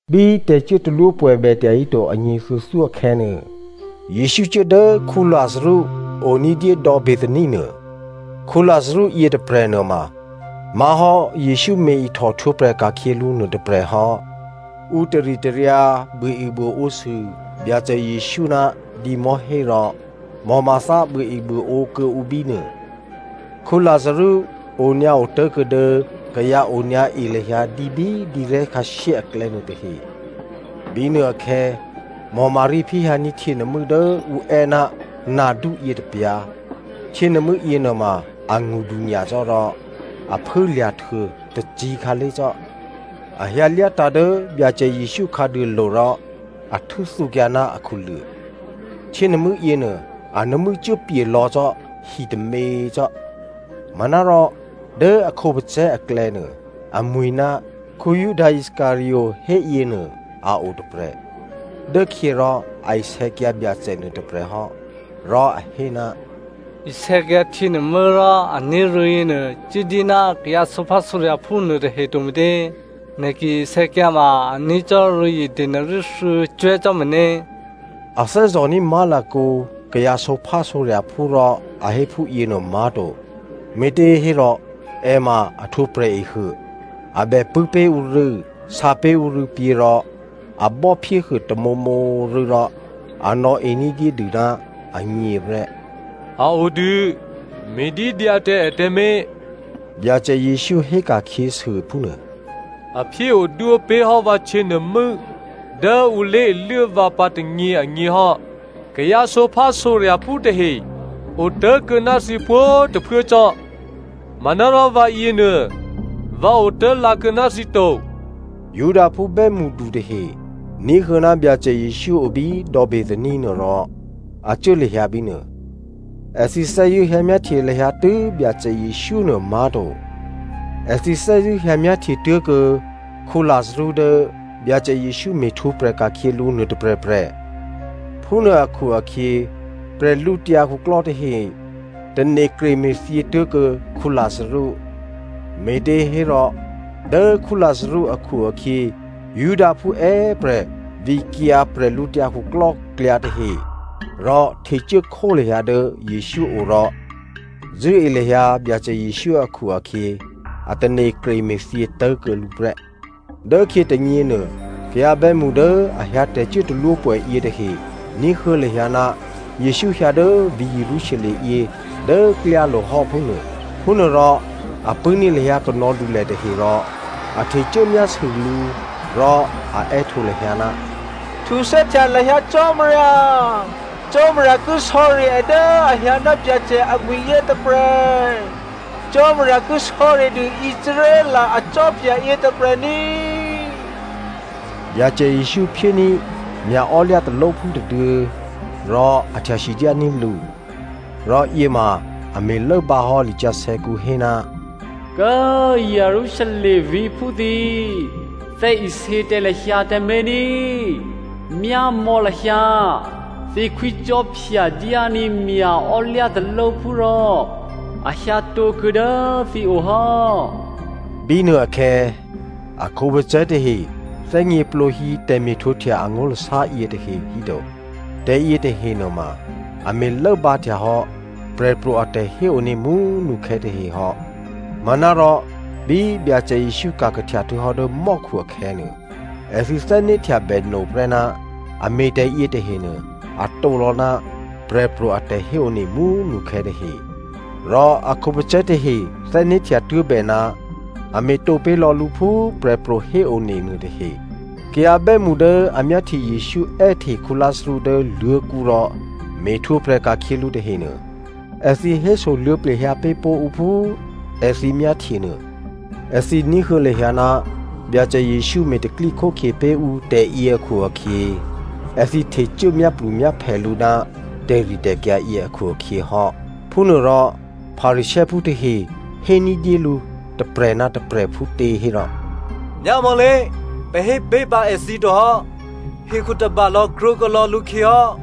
Bí tè̤cuốtalwópwè̌ bètya híto anyě thuô̌thyó akhè̌nuô, Jesǔ cuố dố Lazarú o ní̤dyé dò̌ Bethania nuô. Lazarú yětôprè̤ nuôma má̤hò́ Jesǔ me̤ ihtòhtwǒprè̤ ka̤khyě lǔ nuôtôprè̤ hò́. Ǔ taritaryǎ buôebuôǒsû Byacè Jesǔ ná dǐmò̤́hé rò Martha buôebuôǒ kuô̌ǔ bínuô. Lazarú onyǎ otố̤kuô̌ dố kayǎ onyǎ e lahyǎ dǐ bí dǐrè̤́ khǎshyé aklè̌ nuôtahe. Bínuôakhè̌ Maria phyéhyǎní̤ htyěnuô̤mû́ dố ǔ è́ ná nardú yětôpyǎ̤. Htyěnuô̤mû́ yěnuôma angṳdu nyacò́ rò a phû꤮ lya̤htuô tôcǐ̤ khǎlé̤ cò́. A hyǎ lyátǎ̤ dố Byacè Jesǔ khǎduôlo̤ rò a htû́thǔkyǎ ná akhuluô̤. Htyěnuô̤mû́ yěnuô, a nuô̤mû́ cuốpye̤ lò̌ cò́ hi tômě cò́. Manárò, dố a khǒpacè̤̌ aklè̌nuô, amwi̤ ná Juda Iscariot héyěnuô a otôprè̤. Dố khyě rò a isè̌kyǎ Byacè nuôtôprè̤ hò́, rò a hé, “Isè̌kyǎ htyěnuô̤mû́ rò a ní̤ rû̌ yěnuô cuốdyé ná kayǎ sǒphásǒrya̤phú nuôtahe to me̤tě? Nè̤ ki isè̌kyǎ ma a ní̤ cò́ rû̌zye denari thuô̌cwè̤́ cò́ meně!” A thè́zò̤ní̤ má̤lakǒ kayǎ sǒphásǒrya̤phú rò a hé phúyěnuô má̤to, me̤těhérò è ma a htwǒ prè̤ehuô. A bè pṳ̂́ pé̤ ǔ rû̌, sǎpé̤ ǔ rû̌pyě̤ rò a bò́phyéhuô tamǒmǒ rû̌ rò a nò̌e ní̤dyédû ná agněprè́. “A o dû, me̤dídyǎ tǎ è tǎmé̤” Byacè Jesǔ héka̤khyěsû phúnuô. “A phyé odwó pé̤hò́ vǎ htyěnuô̤mû́ dố ǔ lé̤iluố vǎ pǎ tônyě agněhò́. Kayǎ sǒphásǒrya̤phú tahe otố̤kuô̌ ná thǐ pwǒ̤꤮ tôphuố cò́, manárò vǎyěnuô vǎ otố̤lǎ kuô̌ ná thǐ to.” Judaphú bè́mṳdu tahe ní̤huô̌ ná Byacè Jesǔ obí dò̌ Bethania nuô rò a cuố lahyǎ bínuô. Èthǐ thè́zṳ̂́ hyǎmyáhtye lahyǎ tû́ Byacè Jesǔ nuô má̤to, èthǐ thè́zṳ̂́ hyǎ myáhtye tuố̤kuô̌ Lazarú dố Byacè Jesǔ me̤htwǒprè̤ ka̤khyě lǔ nuôtôprè̤prè̤. Phúnuô akhu-akhyě prè̤lǔtyǎ khuklò́ tahe tane̤ kreme̤thyě tố̤kuô̌ Lazarú. Me̤těhérò dố Lazarú akhu-akhyě, Judaphú è́prè̤ vǐkyǎ bwídukhu tahe rò htecuốkhó lahyǎ dố Jesǔ o rò zṳ̂́e lahyǎ Byacè Jesǔ akhu-akhyě a tane̤ kreme̤thyě tố̤kuô̌ lǔ prè́. Dốkhyě tônyěnuô, kayǎ bè́mṳ dố a hyǎ tè̤cuốtalwópwè̌ yětahe ní̤huô̌ lahyǎ ná Jesǔ hyǎ dố vǐ̤ Jerusalem yě dố klyálo̤ hò́ phúnuô. Phúnuôrò a pṳ̂́ní̤ lahyǎ kanò̌dulè tahe rò a htecuố myásû lǔ, rò a è́htǒ lahyǎ, “Htuthè́htya lahyǎ Cò́marya!” “Cò́marya ki sò̌ri è dố a hyǎ ná Byacè amwi̤ yětôprè̤!” “Cò́marya ki sò̌ridû Israel akhwí yětôprè̤ ní꤮” Byacè Jesǔ phyéní̤ mya̤ò́lyǎ talóphú tôduô̌ rò a htya sidyání̤ lǔ. Rò yěma a me̤ lốbǎhò́ lisǎsè̌kǔ hé, “Kố꤮ Jerusalem vǐ̤phú thǐ꤮! Thè́isě tǎ lahyǎ tǎmé̤ ní! Myámò̌ lahyǎ, thǐ khwícò́phya dyání̤ mya̤ò́lyǎ talóphú rò a hyǎtǒkuô̌ dố thǐo hò́.” Bínuôakhè̌ a khǒpacè̤̌ tahe thè́gněplǒhí tè̤me̤htwǒhtya angó̤lasá yětahe híto. Tè̤ yětahe nuôma a me̤ lốbǎhtyahò́ prè̤pro̤ a tè̤héone mú꤮ nukhè̌ tahehò́. Manárò, bí Byacè Jesǔ ka̤kahtya htuô̌hò́ dố mò́khu akhè̌nuô, èthǐ thè́né̤htyabè noprè́ ná a me̤ tè̤yětahenuô a tǒlò̌ ná prè̤pro̤ a tè̤héone mú꤮ nukhè̌ tahe. Rò a khǒpacè̤̌ tahe thè́né̤htya tuố̤bè ná a me̤tǒ pé̤lò̌ lǔ phú prè̤pro̤ héone nuôtahe. Kayǎ bè́mṳ dố a myáhtye Jesǔ è́hte Lazarú dố luô̤̌kǔ rò me̤htwǒprè̤ ka̤khyě lǔ tahenuô, èthǐ hésoluô̌ plehyǎ pé̤ pó̤ ǔ phú èthǐ myáhtye nuô. Èthǐ ní̤huô̌ lahyǎ ná Byacè Jesǔ me̤ tè̤pro̤tè̤prya̤ pé̤ ǔ tè̤yě akhu-akhyě, èthǐ htecuố myáplumyáphè lǔ ná tè̤ritè̤kyǎ yě akhu-akhyě hò́. Phúnuôrò Pharisěophú tahe hé ní̤dyé lǔ tôprè̤ ná tôprè̤ phútě hérò, “Myámò̌lé! Pè̤ hépé̤ pǎ èthǐ tohò́. Hekhu tôbalò̌ krwǒkuô̌ lò̌ lǔkhyě hò́!”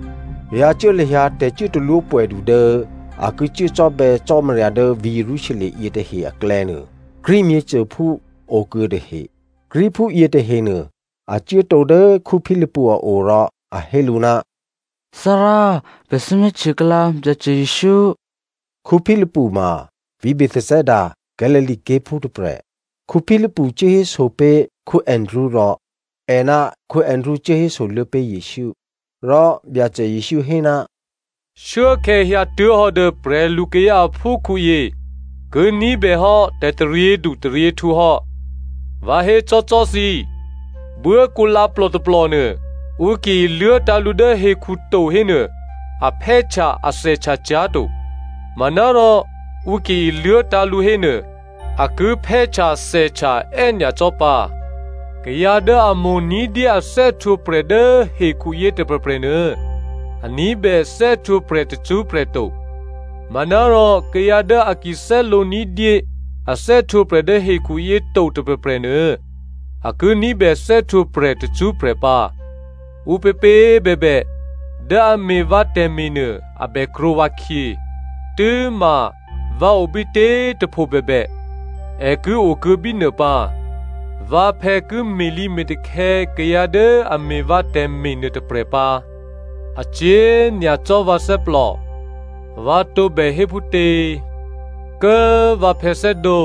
Kayǎ cuố lahyǎ tè̤cuốtalwó pwè̌du dố a ki cuố cò́bè̌ Cò́marya dố vǐ̤ Jerusalem yětahe aklè̌nuô, Greek myěcôphú okuô̌ tahe. Greekphú yětahenuô, a cuốtǒ dố Philipu a o, rò a hé lǔ, “Thárá, pè̤ thè́ myáhtye kuô̌lǎ Byacè Jesǔ.” Philipu ma vǐ̤ Bethsaida, Galilea ké̤phú tôprè̤. Philipu cuố héso pé̤ Andrea rò è ná Andrea cuố hésoluô̌ pé̤ Jesǔ. Rò Byacè Jesǔ hé, “Shuốkhè̌ hyǎtuố̤hò́ dố prè̤lukayǎ aphúkhǔyě ki ní̤bèhò́ tè̤taryědu taryěhtǔ hò́. Vǎ hécò́cò́ thǐ, buốkǔlǎplò tôplònuô, ǔ ki iluố̤tǎ̤ lǔ dố hekhu to hénuô, a phè́htya a thèhtya cyá̤to. Manárò ǔ ki iluố̤tǎ̤ lǔ hénuô, a ki phè́htya thèhtya è́nyacò́ pǎ. Kayǎ dố a mo̤ ní̤dyé a thè́htwǒprè̤ dố hekhuyě tôprè̤prè̤ nuô, a ní̤bè thè́htwǒprè̤ tacṳ́prè̤ to. Manárò kayǎ dố a ki thè́lǒ ní̤dyé a thè́htwǒprè̤ dố hekhuyě to tôprè̤prè̤ nuô, a ki ní̤bè thè́htwǒprè̤ tacṳ́prè̤ pǎ. Ǔpěpě꤮ bèbè dố a me̤ vǎ tè̤me̤ nuô, a bèkrwǒ vǎkhyě. Tû́ma, vǎ obítě꤮ tôpho bèbè, è ki okuô̌ bínuô pǎ. Vǎphè̌ ki me̤lǐme̤takhè̌ kayǎ dố a me̤ vǎ tè̤me̤ nuôtôprè̤ pǎ. “A cyě̤ nyacò́ vǎ thè́plò. Vǎ tǒbè hé phútě? ‘Kố꤮ vǎphè̌ thè́dǒ,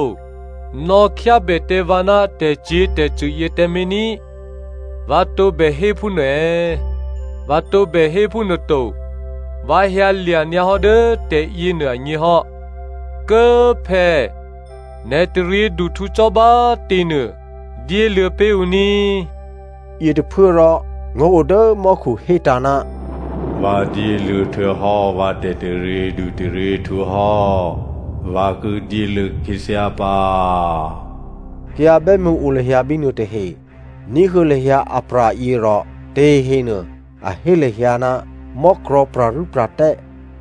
nò̌khyábè tǎ vǎ ná tè̤cyě̤tè̤cṳ̂ yě tǎmé̤ ní꤮’ vǎ tǒbè hé phúnuô è̌? Vǎ tǒbè hé phúnuô to. Vǎ hyǎlya̤ nyǎ hò́ dố tè̤yěnuô agněhò́. Kố꤮ phè̌, nè̤ taryěduhtǔ cò́ bá꤮ tě nuô, dyéluô̌ pé̤ ǔ ní꤮.” Yětôphuốrò ngó̤ o dố mò́khu hétǎ̤, “Vǎ dyéluô̌ htuô̌hò́ vǎ tè̤taryědu taryěhtǔ hò́, vǎ ki dyéluô̌ khyěthyá pǎ.” Kayǎ bè́mṳ o lahyǎ bínuô tahe ní̤huô̌ lahyǎ apra̤yě rò tahehe nuô a hé lahyǎ, mò́krò̤̌ pra̤rû́pra̤tè́,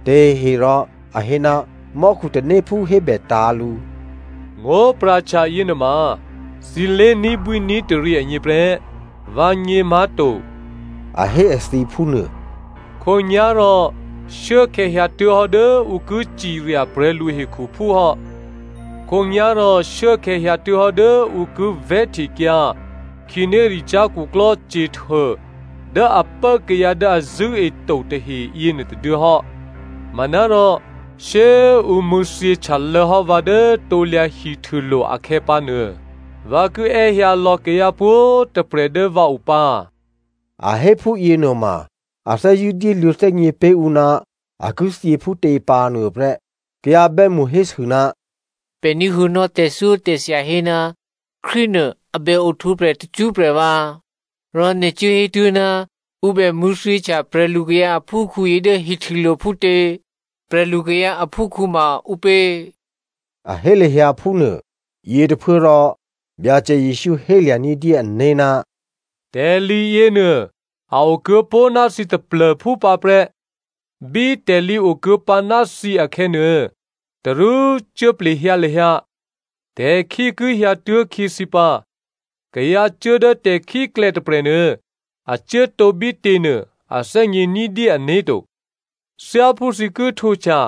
tahehe rò a hé, mò́khu tanéphú hébètǎ̤ lǔ. “Ngó̤pra̤htya yěnuôma thǐ lé̤ní̤bwí ní̤taryě agněprè́, vǎgně má̤to,” a hé èthǐ phúnuô. “Khǒnyá̤rò shuốkhè̌ hyǎtuố̤hò́ dố ǔ ki cirya prè̤lu hekhuphú hò́. Khǒnyá̤rò shuốkhè̌ hyǎtuố̤hò́ dố ǔ ki vè̤́htekyǎ khǐnéricyá̤ khuklò́ Satan dố a pố kayǎ dố a zṳ̂́eto tahe yěnuô tôduô̌ hò́. Manárò shyé꤮ ǔ mṳ̂̌thyěhtyalô̌hò́ vǎ dố krusu díkè hihtûlo̤ akhè̌pǎnuô, vǎ ki è́hyǎ lò̌ kayǎ pwǒ̤꤮ tôprè̤ dố vǎo pǎ.” A hé phúyě nuôma a thè́zṳ̂́ dyéluô̌ thè́gně pé̤ ǔ ná a ki thyě phútě pǎ nuôprè́. Kayǎ bè́mṳ hésû, “Pè̤ ní̤huô̌nò́ tè̤thyótè̤thya hé ná Krístunuô a bè ohtwǒprè̤ tacṳ́prè̤ vǎ, rò nè̤ cuố hétuố̤, ‘Ǔ bè mṳ̂̌thyěhtya prè̤lukayǎ aphúkhǔyě dố hihtûlo̤’ phútě? ‘Prè̤lukayǎ aphúkhǔ’ ma ǔpě?” A hé lahyǎ phúnuô. Yětôphuốrò Byacè Jesǔ hélya̤ ní̤dyé ané̤, “Tè̤lǐ yěnuô a okuô̌pó̤ ná thǐ taplô̤phú pǎprè́. Bí tè̤lǐ okuô̌pǎ ná thǐ akhè̌nuô, tarú cuốplehyǎ lahyǎ. Tè̤khí ki hyǎtuố̤ khyě thǐ pǎ. Kayǎ cuố dố tè̤khíklè̌ tôprè̤nuô, a cuốtǒ bítěnuô, a thè́gně ní̤dyé ané̤ to. Thyáphú thǐ ki htwǒhtya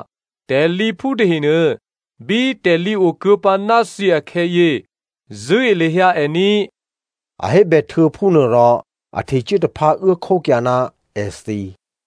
tè̤lǐphú tahenuô, bí tè̤lǐ okuô̌pǎ ná thǐ akhè̌yě, zṳ̂́e lahyǎ è ní꤮.” A hébè htuô̌ phúnuô rò a htecuố taphǎ uốkhókyǎ ná èthǐ.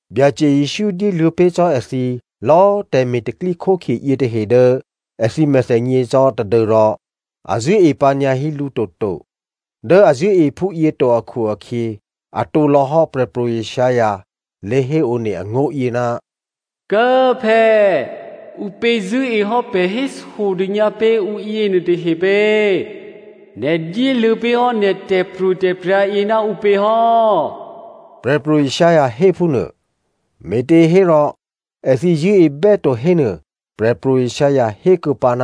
Byacè Jesǔ dyéluô̌ pé̤ cò́ èthǐ lò̌ tè̤me̤ tè̤pro̤tè̤prya̤ yětahe dố èthǐ mèthènyě cò́ tadû́rò a zṳ̂́e pǎnyǎhí lǔ toto. Dố a zṳ̂́e phúyě to akhu-akhyě, atǒ lò̌hò́ Prè̤pro̤ Isaiah lé̤héone angó̤yě, “Kố꤮ phè̌, ǔpě zṳ̂́ehò́ pè̤ hésodônyǎ pé̤ ǔ yěnuô tahe pě? Nè̤ dyéluô̌ pé̤hò́ nè̤ tè̤pro̤tè̤prya̤ yě ná ǔpěhò́?” Prè̤pro̤ Isaiah héphúnuô. Me̤těhérò èthǐ zṳ̂́ebè́ to hénuô, Prè̤pro̤ Isaiah hékuô̌pǎ,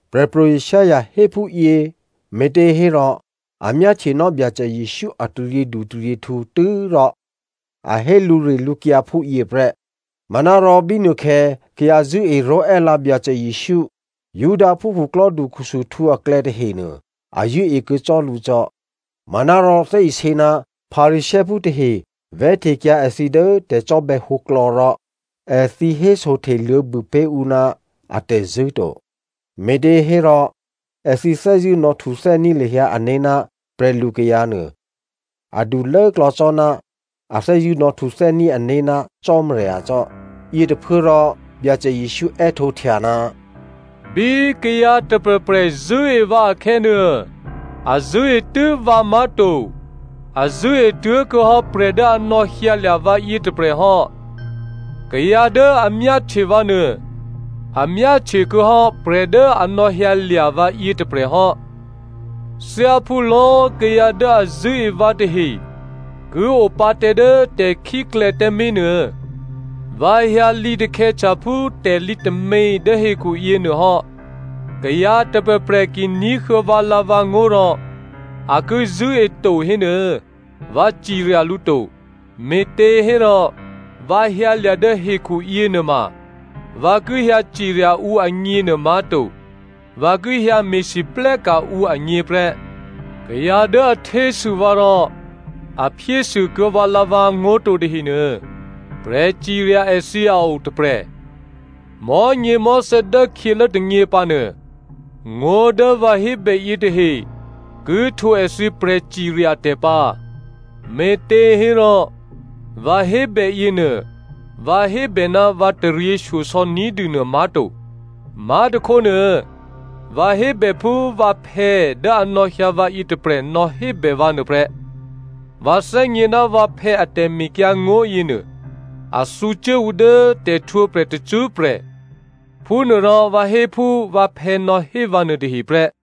Prè̤pro̤ Isaiah héphúyě me̤těhérò a myáhtyenò́ Byacè Jesǔ a taryědutaryěhtǔ tû́rò a hé lǔrilǔkyǎ phúyě prè́. Manárò bínuôkhè̌ kayǎ zṳ̂́e ró̤è́lǎ Byacè Jesǔ. Judaphú khuklò́du khusuhtǔ aklè̌ tahenuô a zṳ̂́ekuô̌ cò́ lǔ cò́. Manárò thè́isě ná Pharisěophú tahe vè̤́htekyǎ èthǐ dố tè̤cò́bè̌ hǒklò̌ rò, èthǐ hésohte luô̌bû pé̤ ǔ ná atè̤zṳ̂́ to. Me̤těhérò, èthǐ thè́zṳ̂́ nò̌htuthè́ní̤ lahyǎ ané̤ ná prè̤lu kayǎ nuô adu lốklò̌ cò́ ná a thè́zṳ̂́ nò̌htuthè́ní̤ ané̤ ná Cò́marya cò́. Yětôphuốrò Byacè Jesǔ è́htǒhtya, “Bí kayǎ tôprè̤prè̤ zṳ̂́e vǎ akhè̌nuô, a zṳ̂́e tû́ vǎ má̤to, a zṳ̂́e tuố̤kuô̌hò́ prè̤ dố a nò̌hyǎlya̤ vǎyě tôprè̤ hò́. Kayǎ dố a myáhtye vǎ nuô, a myáhtye kuô̌hò́ prè̤ dố a nò̌lya̤ vǎyě tôprè̤ hò́. Thyáphú lò̌꤮ kayǎ dố a zṳ̂́e vǎ tahe ki opǎ tǎ dố tè̤khíklè̌ tǎmé̤ nuô vǎ hyǎ lǐtakhè̌htya phú tè̤lǐ tômě dố hekhu yěnuôhò́. “Kayǎ tôprè̤prè̤ ki ní̤huô̌ vǎlǎ̤vǎngó̤ rò a ki zṳ̂́eto hénuô, vǎ cirya lǔ to. Me̤těhérò, vǎ hyǎlya̤ dố hekhu yěnuôma, vǎ ki hyǎ cirya ǔ agněnuô má̤to, vǎ ki hyǎ me̤lwóhteka̤ ǔ agněprè́. Kayǎ dố a htésû vǎ rò a phyésû kuô̌ vǎlǎ̤vǎngó̤ to tahenuô, prè̤cirya èthǐ a otôprè̤. Mò̤́nyěmò̤́thè̌ dốkhyělố tônyěpǎ nuô, ngó̤ dố vǎ hébè yětahe ki htwǒ èthǐ prè̤cirya tè̤ pǎ. Me̤těhérò, vǎ hébè yěnuô, vǎ hébè ná vǎ taryěshyosò̌ ní̤dû nuô má̤to. Má̤tôkhónuô vǎ hébè phú vǎphè̌ dố a nò̌hyǎ vǎyě tôprè̤ nò̌hébè vǎ nuôprè́. Vǎ thè́gně ná vǎphè̌ a tè̤mekyǎngó̤ yěnuô a thǔcuố ǔ dố tè̤htwǒprè̤ tacṳ́prè̤. Phúnuôrò vǎ hé phú vǎphè̌ nò̌hé vǎ nuôtahe prè́.”